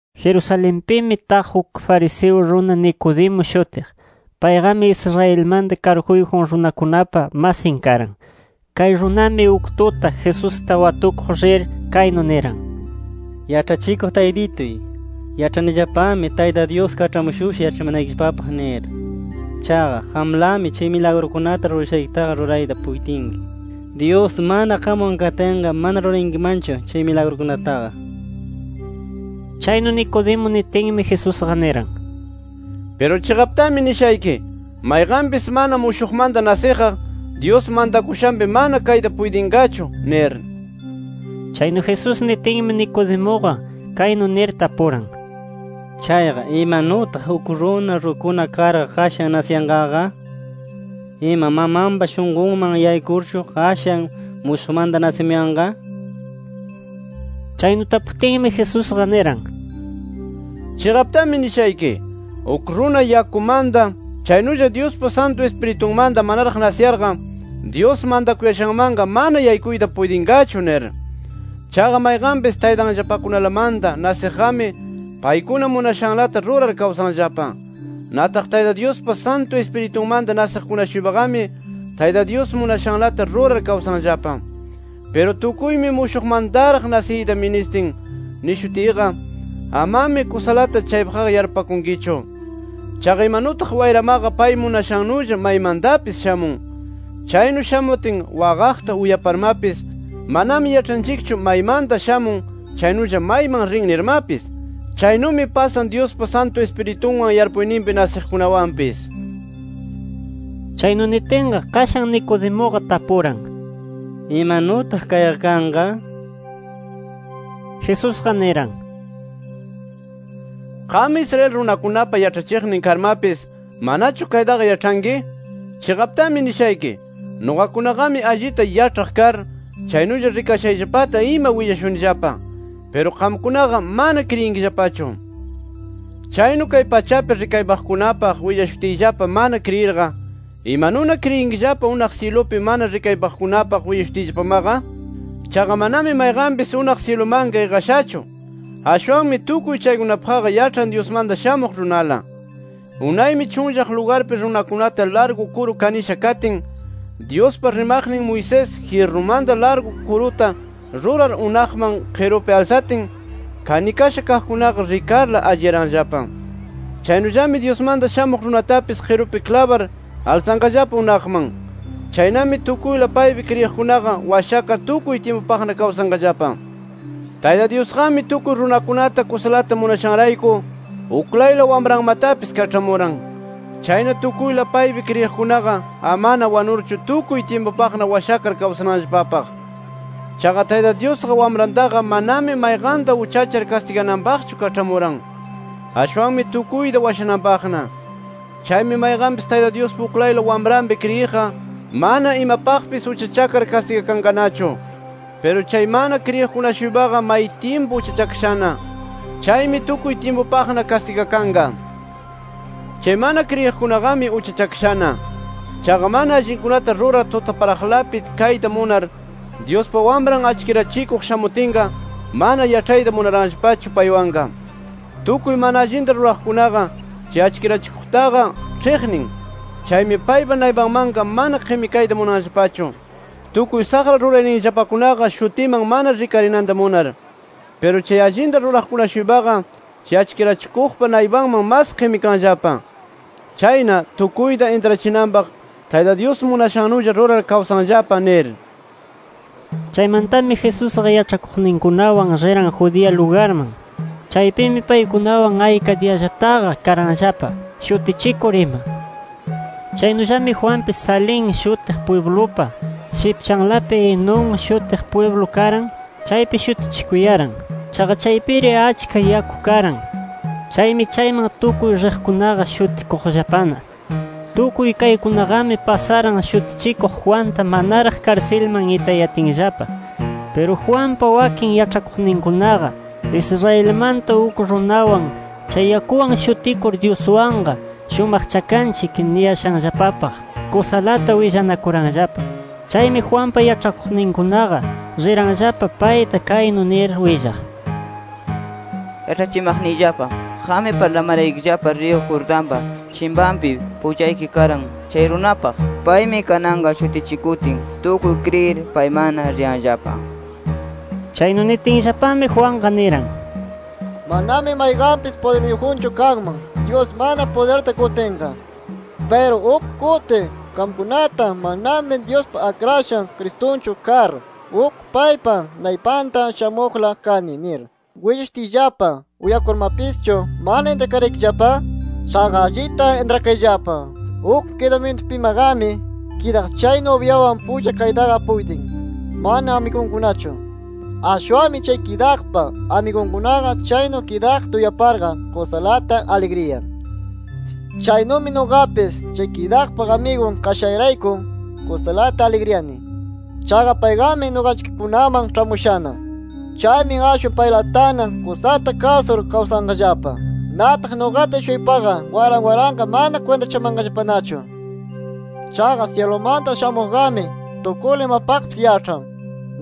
Jerusalenpimi taq uk fariseo runa Nicodemo shutiq. Payqami Israelmanta karguyjun runakunapa masin karan. Kay runami uk tuta, Jesusta watukuq rir, kaynu niran: —Yaĉhachikuq Taytituy, yaĉhanillapami Tayta Dyus kaĉhamushusha yaĉhachimanaykillapapaq nir. Chaqa, qamlami chay milagrukunata rurashaykitaqa rurayta puytinki. Dyus mana qamwan katinqa, mana rurayankimanchu chay milagrukunataqa nir. Chaynu Nicodemo nitinmi, Jesusqa niran: —Piru chiqaptami nishayki: Mayqanpis mana mushuqmanta nasiqqa, Dyus mantakushanpi mana kayta puytinqachu nir. Chaynu Jesús nitinmi, Nicodemuqa, kaynu nir tapuran: —Chayqa, ¿imanutaq uk runa rukuna karqa qashan nasiyanqaqa? ¿Ima mamanpa shunqunman yaykurchu, qashan mushuqmanta nasimuyanqa? Chaynu taputinmi, Jesusqa niran: —Chiqaptami nishayki: Uk runa yakumanta chaynulla Dyuspa Santu Ispiritunmanta manaraq nasiyarqa, Dyus mantakuyashanmanqa mana yaykuyta puytinqachu nir. Chaqa mayqanpis taytanllapakunalamanta nasiqqami paykuna munashanlata rurar kawsanllapa. Nataq Tayta Dyuspa Santu Ispiritunmanta nasiqkuna-shuypaqami Tayta Dyus munashanlata rurar kawsanllapa. Piru ‘Tukuymi mushuqmantaraq nasiyta ministin’ nishutiyqa, amami kusalata chaypaqqa yarpupakunkichu. Chaqa imanutaq wayramaqa pay munashannulla maymantapis shamun. Chaynu shamutin waqaqta uyaparmapis manami yaĉhankichu maymanta shamun chaynulla mayman rin nirmapis. Chaynumi pasan Dyuspa Santu Ispiritunwan yarpuyninpi nasiqkunawanpis. Chaynu nitinqa, qashan Nicodemuqa tapuran: —¿Imanutaq kayqa kanqa? nir. Jesusqa niran: —¿Qam Israel runakunapa yaĉhachiqnin karmapis, manachu kaytaqa yaĉhanki? Chiqaptami nishayki: Nuqakunaqami allita yaĉhaq kar chaynulla rikashayllapata ima willashunillapa. Piru qamkunaqa mana kriyinkillapachu. Chaynu kay pachapi rikaypaqkunapaq willashutiyllapa mana kriyirqa, ¿imanuna kriyinkillapa unaq syilupi mana rikaypaqkunapaq willashutiyllapamaqa? “Chaqa manami mayqanpis unaq syilumanqa iqashachu. Ashwanmi tukuy chaykunapaqqa yaĉhan Dyusmanta Shamuq Runala. “Unaymi chunllaq lugarpi runakunata largu kuru kanisha katin, Dyuspa rimaqnin Moisés, jyirrumanta largu kuruta rurar unaqman qirupi alsatin, kanikasha kaqkunaqa rikarla, alliyaranllapa. Chaynullami Dyusmanta Shamuq Runatapis qirupi klabar alsanqallapa unaqman. Chaynami tukuyla paypi kriyiqkunaqa washakar tukuy tyimpupaqna kawsanqallapa. “Tayta Dyusqami tukuy runakunata kusalata munashanrayku uklayla Wamranmatapis kaĉhamuran. Chayna tukuyla paypi kriyiqkunaqa amana wanurchu tukuy tyimpupaqna washakar kawsananllapapaq. Chaqa Tayta Dyusqa Wamrantaqa manami mayqanta uchachar kastigananpaqchu kaĉhamuran, ashwanmi tukuyta washananpaqna. “Chaymi mayqanpis, Tayta Dyuspa uklayla Wamranpi kriyiqqa, mana imapaqpis uchachakar kastigakanqanachu. Piru chay mana kriyiq-shuypaqa may tyimpu uchachakashana. Chaymi tukuy tyimpupaqna kastigakanqa. Chay mana kriyiqkunaqami uchachakashana. Chaqa mana allinkunata rurar tutaparaqlapi kayta munar, Dyuspa Wamran achkirachikuq shamutinqa, mana yaĉhayta munaranllapachu paywanqa. Tukuy mana allinta ruraqkunaqa, chay achkirachikuqtaqa ĉhiqnin. Chaymi paypa naypanmanqa mana qimikayta munanllapachu, tukuy saqra rurayninllapakunaqa shutiman mana rikarinanta munar. Piru chay allinta ruraqkuna-shuypaqa chay achkirachikuqpa naypanman mas qimikanllapa. Chayna tukuyta intrachinanpaq Tayta Dyus munashannulla rurar kawsanllapa nir”. Chaymantami Jesusqa yaĉhakuqninkunawan riran Judea lugarman. Chaypimi paykunawan ayka diyallataqa karanllapa shutichikur ima. Chaynullami Juanpis, Salim shutiq pwiblupa shipchanlapi Enón shutiq pwiblu karan, chaypi shutichikuyaran. Chaqa chaypiri achka yaku karan. Chaymi chayman tukuy riqkunaqa shutikuqllapana. Tukuy kaykunaqami pasaran Shutichikuq Juanta manaraq karsilman itayatinllapa. Piru, Juanpa wakin yaĉhakuqninkunaqa, Israelmanta uk runawan, chay yakuwan shutikur Dyuswanqa shumaqchakanchik niyashanllapapaq kusalata willanakuranllapa. Chaymi Juanpa yaĉhakuqninkunaqa riranllapa payta kaynu nir willaq: —Yaĉhachimaqniyllapa, qammi parlamaraykillapa riyu Jordanpa chimpanpi pullayki karan, chay runapaq. Paymi kananqa shutichikutin, tukuy kriyir paymanna riyanllapa. Chaynu nitinllapami, Juanqa niran: —Manami mayqanpis pudirniyjunchu kanman, Dyus mana pudirta qutinqa. Piru uk kuti qamkunata ‘Manami Dyuspa Akrashan Cristunchu kar, uk paypa naypanta shamuqla kani’ nir willashutiyllapa uyakurmapischu ¿mana intrakaraykillapa? Chaqa allita intrakayllapa: Uk kidamyintupimaqami kidaq chay, nubyawan pulla kaytaqa puytin, mana amigunkunachu. Ashwanmi chay kidaqpa amigunkunaqa chaynu kidaqta uyaparqa kusalata aligriyan. Chaynumi nuqapis chay kidaqpa amigun kashayrayku kusalata aligriyani. Chaqa payqami nuqanchikkunaman ĉhamushana. Chaymi ashwan paylatana kusata kasur kawsanqallapa. Nataq nuqata-shuypaqa waran waranqa mana kwintachamanqallapanachu. “Chaqa syilumanta shamuqqami, tukuyla imapaqpis yaĉhan.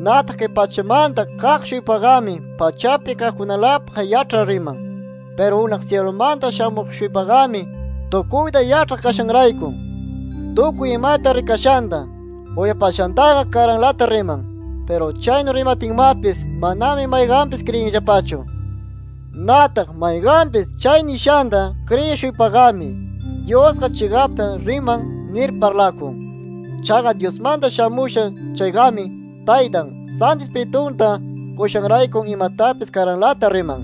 Nataq kay pachamanta kaq-shuypaqami pachapi kaqkunalapaq yaĉhar riman. Piru unaq syilumanta shamuq-shuypaqami, tukuyta yaĉhaq kashanrayku, tukuy imata rikashanta, uyapashantaqa karanlata riman. Piru chaynu rimatinmapis, manami mayqanpis kriyinllapachu. Nataq mayqanpis chay nishanta kriyiq-shuypaqami Dyusqa chiqapta riman nir parlakun. Chaqa Dyusmanta shamusha chayqami Taytan, Santu Ispiritunta qushanrayku imatapis karanlata riman.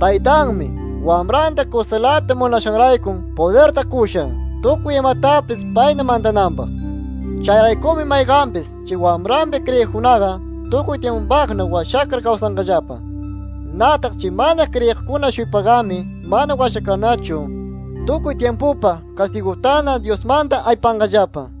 Taytanmi, Wamranta kusalata munashanrayku pudirta qusha tukuy imatapis payna mantananpaq. Chayraykumi mayqanpis chay Wamranpi kriyiqkunaqa, tukuy tyimpupaqna washakar kawsanqallapa. Nataq chay mana kriyinaqkuna-shuypaqami mana washakarnachu, tukuy tyimpupaq kastigutana Dyusmanta aypanqallapa”.